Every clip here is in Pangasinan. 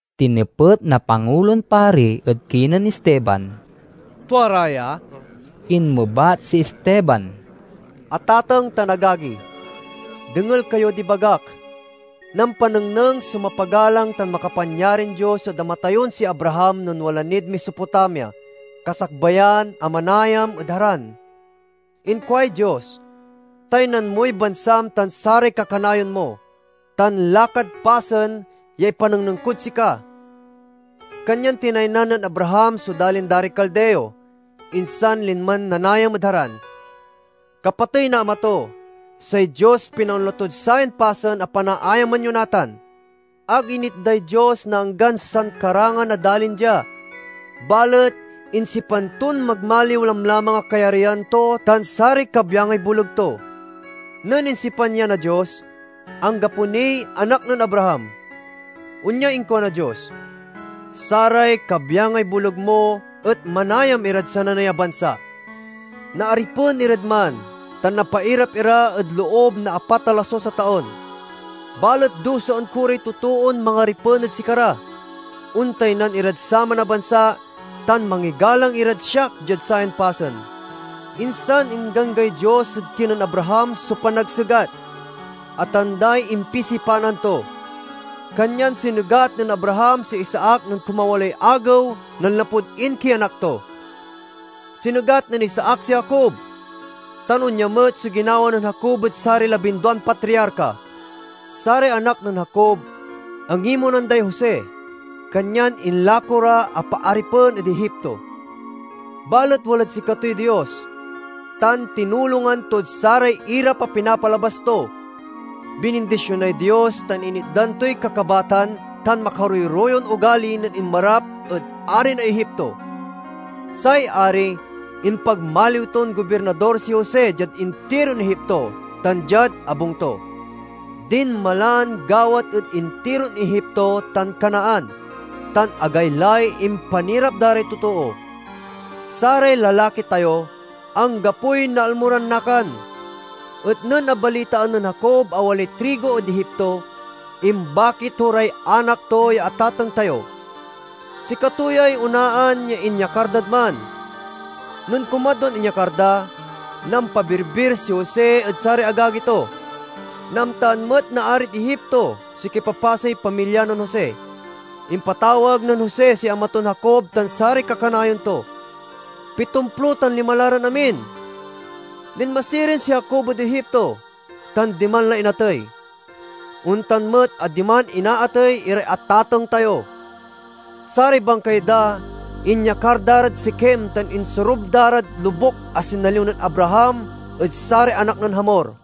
Tinepet na Pangulon Pari ed kinen Esteban, "Tua ra ya?" Inmebat si Esteban, "Atateng tan agagi, dengel kayod ibagak. Nampanengneng so mapagalang tan makapanyarin Dios ed ama tayon si Abraham nen wala nid Mesopotamia, kasakbayan a manayam ed Haran. Inkuay Dios, 'Taynan moy bansam tan saray kakanayon mo, tan lakad pasen ya ipanengneng kod sika!' Kanyan tinaynan nen Abraham so dalin da ray Caldeo, insan linman nanayam ed Haran. Kapatey na ama to, say Dios pinaonla tod sayan pasen a panaayaman yo natan. Ag initday Dios na anggan sankarangan a dalin dia, balet insipan ton magmaliw lamlamang a kayaryan to tan saray kabyangay boleg to. Nen insipan ya na Dios, anggapo niy anak nen Abraham. Onyay inkuan na Dios, 'Saray kabyangay boleg mo et manayam irad sananey a bansa. Naaripen irad man tan napairad ira ed loob na apat a lasus a taon. Balet dusaen ko ray totoon mangaripen ed sikara; ontaynan irad saman a bansa, tan mangigalang irad siak diad sayan pasen.' Insan ingganggay Dios ed kinen Abraham so panagsegat, a tanday impisipanan to. Kanyan sinegat nen Abraham si Isaac nen kumawaloy agew nanlapud inkianak to. Sinegat nen Isaac si Jacob, tan onya met so ginawa nen Jacob ed saray labinduan patriarka. "Saray anak nen Jacob angimonan day Jose, kanyan inlako ra a paaripen ed Egipto. Balet walad sikatoy Dios, tan tinulongan tod saray irap a pinapalabas to. Binindisionay Dios tan initdan toy kakabatan tan makaroyroyon ogali nen inmarap ed ari na Egipto. Say Ari impagmaliw ton gobirnador si Jose diad intiron Egipto tan diad abung to. Dinmalan gawat ed intiron Egipto tan Canaan, tan agaylay impanirap da ray totoo. Saray lalaki tayo anggapoy naalmo ran nakan. Et nen abalitaan nen Jacob a walay trigo ed Egipto, imbaki to ray anak to ya atateng tayo. Sikato yay onaan ya inyakar dad man. Nen kumadwan inyakar da, nampabirbir si Jose ed saray agagi to. Naamtaan met na arid Egipto so kipapasey pamilya nen Jose. Impatawag nen Jose si ama ton Jacob tan saray kakanayon to; pitomplo tan lima ran amin. Linma sirin si Jacob ed Egipto, tan diman la inatey; ontan met a diman inaatey iray atateng tayo. Saray bangkay da inyakar da rad Sikem tan insorub da rad lobuk a sinaliw nen Abraham ed saray anak nen Hamor.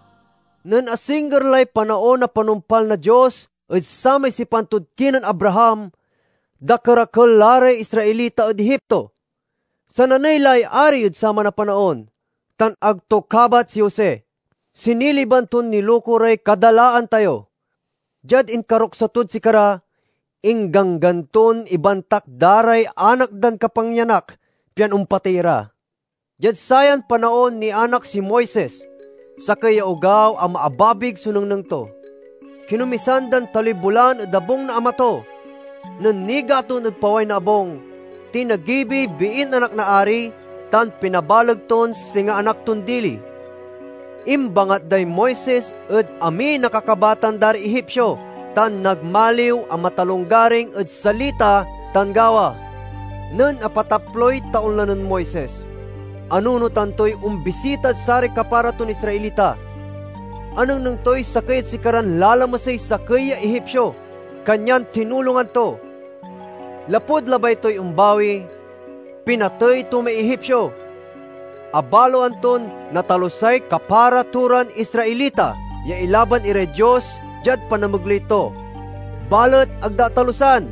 "Nen asingger lay panaon na panumpal na Dios ed samay sipan tod kinen Abraham, dakerakel la ray Israelita ed Egipto. Sananey lay ari ed saman a panaon, tan ag to kabat si Jose. Siniliban ton niluko ray kadalaan tayo. Diad inkaruksa tod sikara, ingganggan ton ibantak da ray anak dan kapangyanak, pian ompatey ira. Diad sayan panaon, nianak si Moises, sakey ya ogaw a maababig so nengneng to. Kinomisan dan taloy bulan ed abung na ama to. Nen nigaton ed paway na abung, tinagibiy biin anak na ari, tan pinabaleg ton singa anak ton dili. Imbangat day Moises ed amin a kakabatan da ray Egipsio, tan nagmaliw a matalonggaring ed salita tan gawa. "Nen apataploy taon la nen Moises, anunotan toy ombisitad saray kapara ton Israelita. Anengneng toy sakey ed sikaran lalamesey sakey ya Egipsio, kanyan tinulongan to. Lapud labay toy ombawi, pinatey to may Egipsio. (Abaloan ton natalusay kapara to ran Israelita ya ilaban iray Dios diad panamegley to, balet ag da atalusan.)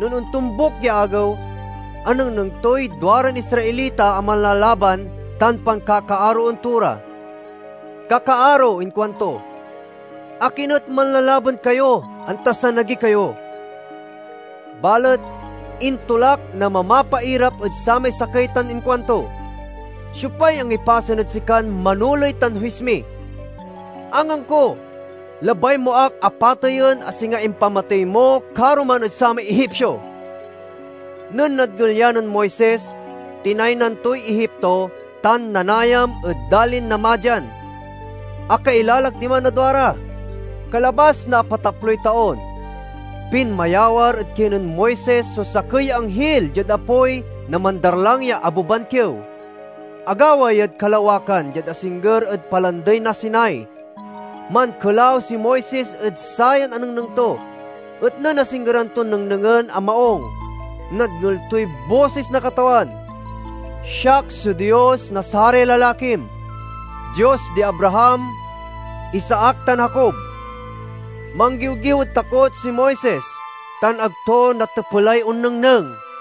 Nen ontombuk ya agew, anengneng toy duaran Israelita a manlalaban, tan pankakaaroen to ra. 'Kakaaro,' inkuanto, 'akin et manlalaban kayo anta sanagi kayo?' Balet intolak na mamapairap ed samay sakey tan inkuanto, 'Siopay angipasen ed sikan manoley tan huis mi? Angangko, labay mo ak a pateyen, a singa impamatey mo karoman ed samay Egipsio!' Nen nadngel ya nen Moises, tinaynan toy Egipto tan nanayam ed dalin na Madian. Akailalak diman na duara. "Kalabas na apataploy taon, pinmayawar ed kinen Moises so sakey ya anghil diad apoy na mandarlang ya abeban kiew. Agawa yad kalawakan diad asingger ed Palandey na Sinai. Mankelaw si Moises ed sayan anengneng to, et nen asinggeran ton nengnengen a maung, nadngel toy bosis na Katawan: 'Siak so Dios na saray lalakim, Dios di Abraham, Isaac tan Jacob.' Manggiwgiw ed takot si Moises, tan ag to natepelay onnengneng.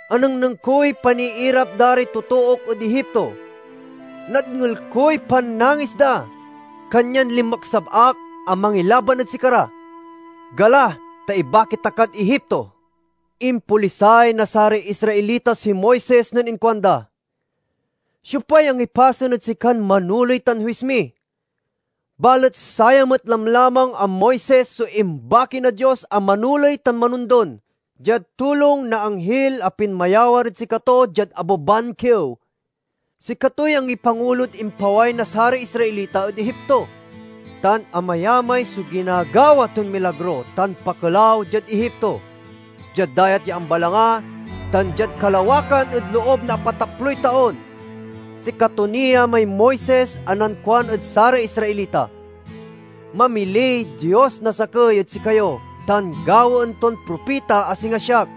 Anengneng koy paniirap da ray totook ed Egipto. Nadngel koy pannangis da, kanyan linmeksab ak a mangilaban ed sikara. Gala, ta ibaki ta kad Egipto!' "Impolisay na saray Israelita si Moises nen inkuanda, 'Siopay angipasen ed sikan manoley tan huis mi?' Balet saya met lamlamang a Moises so imbaki na Dios a manoley tan manondon, diad tulong na anghil a pinmayawar ed sikato diad abeban kiew. Sikatoy angipangulod impaway na saray Israelita ed Egipto, tan amayamay so ginagawa ton milagro tan pakelaw diad Egipto, diad Dayat ya Ambalanga, tan diad kalawakan ed loob na apataploy taon. Sikato ni ya may Moises a nankuan ed saray Israelita, 'Mamiliy Dios na sakey ed sikayo tan gawaen ton propita a singa siak.'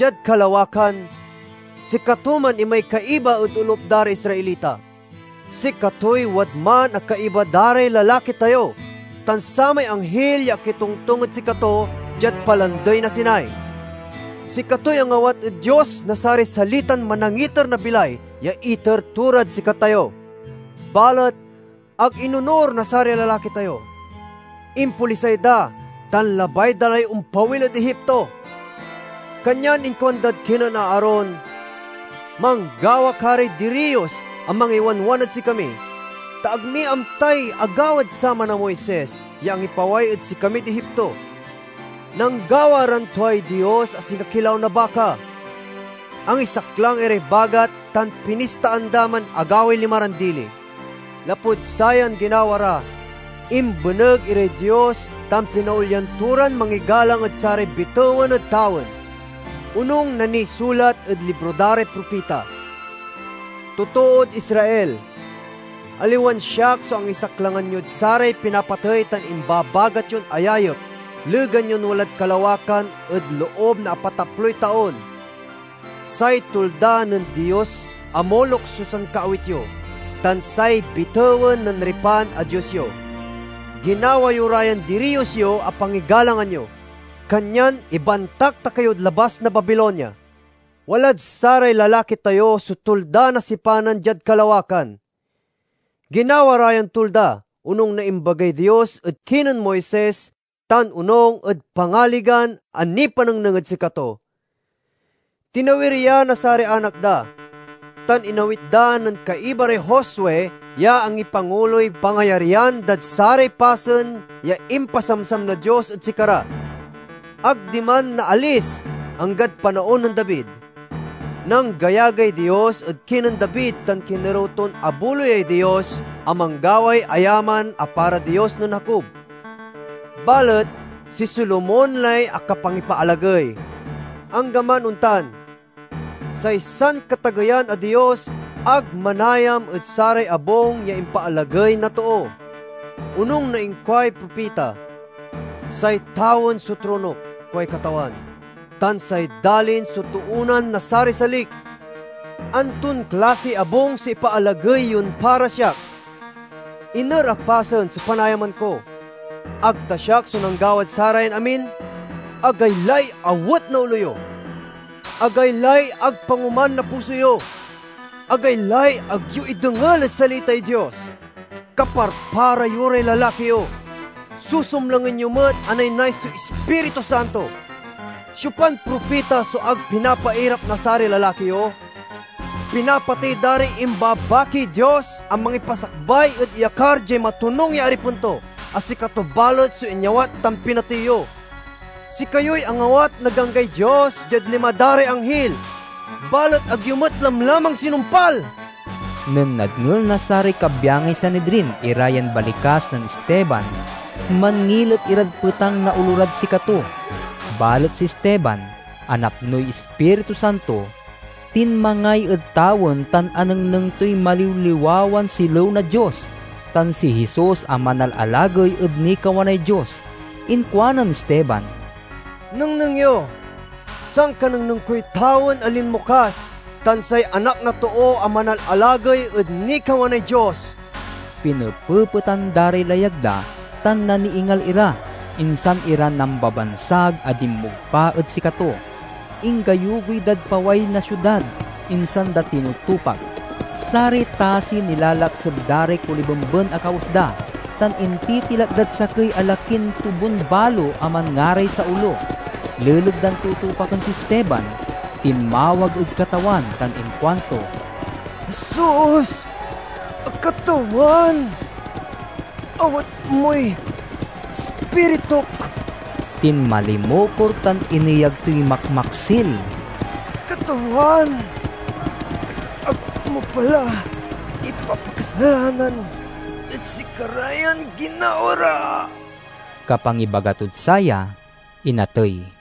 Diad kalawakan sikatoman imay kaiba ed olup da ray Israelita. Sikatoy wadman a kaiba da ray lalaki tayo tan samay anghil ya akitongtong ed sikato, diad Palandey na Sinai. Sikatoy angawat ed Dios na saray salitan manangiter na bilay ya iter to rad sikatayo. "Balet ag inonur na saray lalaki tayo, impolisay da, tan labay da lay ompawil ed Egipto. Kanyan inkuandad kinen Aaron, 'Manggawa ka ray diriyos a mangiwanwan ed sikami, ta ag mi amtay agawad saman a Moises ya angipaway ed sikamid Egipto.' Nanggawa ran tuay dios a singa kilaw na baka. Angisaklang iray bagat tan pinistaan da man a gaway lima ran dili. Lapud sayan ginawa ra, imbeneg iray Dios tan pinaolyan to ran mangigalang ed saray bitewen ed tawen, onung na nisulat ed libro da ray propita: 'Totood Israel, aliwan siak so angisaklangan yod saray pinapatey tan imbabagat yon ayayep legan yon walad kalawakan ed loob na apataploy taon. Say tulda nen dios a Moloc so sankaawit yo, tan say bitewen nen Refan a dios yo: ginawa yo ra yan diriyos yo a pangigalangan yo. Kanyan ibantak ta kayod labas na Babilonia.' "Walad saray lalaki tayo so Tulda na Sipanan diad kalawakan. Ginawa ra yan tulda, onung na imbagay Dios ed kinen Moises tan onung ed pangaligan a nipanengneng ed sikato. Tinawir ya na saray anak da, tan inawit da nen kaiba ray Josue ya angipanguloy pangayaryan dad saray pasen ya impasamsam na Dios ed sikara. Ag diman naalis, anggad panaon nen David. Nanggayagay Dios ed kinen David tan kinerew ton abuloyay Dios a manggaway ayaman a para Dios nen Jacob. Balet si Solomon lay akapangipaalagey. "Anggaman ontan, say Sankatageyan a Dios ag manayam ed saray abung ya impaalagey na too. Onung na inkuay propita, 'Say tawen so tronok, kuay Katawan, tan say dalin so toonan na saray salik. Anton klasiy abung so ipaalagey yon para siak? Iner a pasen so panayaman ko? Ag ta siak so nanggawad sarayan amin?' "Agaylay awet na olo yo! Agaylay ag pangoman na puso yo! Agaylay ag yo idengel ed salitay Dios! Kaparpara yo ray lalaki yo: susumlangen yo met a naynay so Ispiritu Santo! Siopan propita so ag pinapairap na saray lalaki yo? Pinapatey da ray imbabakiy Dios a mangipasakbay ed iyakar diay matonung ya Aripen to, a sikato balet so inyawat tan pinatey yo. Sikayoy angawat na ganggay Dios diad lima da ray anghil, balet ag yo met lamlamang sinumpal!" Nen nadngel na saray kabyangay Sanidrin ira yan balikas nen Esteban manngilet irad petang na olo rad sikato. Balet si Esteban, a napnoy Ispiritu Santo, tinmangay ed tawen tan anengneng toy maliwliwawan silew na Dios, tan si Jesus a manalalagey ed nikawanay Dios. Inkuanen Esteban, "Nengneng yo! Sankanengneng koy tawen a linmokas, tan say Anak na Too a manalalagey ed nikawanay Dios!" Pinepepetan da ray layag da tan naniingal ira, insan ira nambabansag a dinmogpa ed sikato. Inggayugoy dad paway na siudad, insan da tinutupak. Saray tasi nilalakseb da ray kolibemben a kawes da, tan intitilak dad sakey a lakin tobun-balo a manngaray Saulo. Leleg dan tutupaken si Esteban, tinmawag ed Katawan tan inkuanto, "Jesus a Katawan, awat moy Ispirituk." Tinmalimukor tan ineyag toy makmaksil, "Katawan, ag mo pa la ipapakasalanan ed sikara yan ginawa ra!" Kapangibaga tod saya, inatey.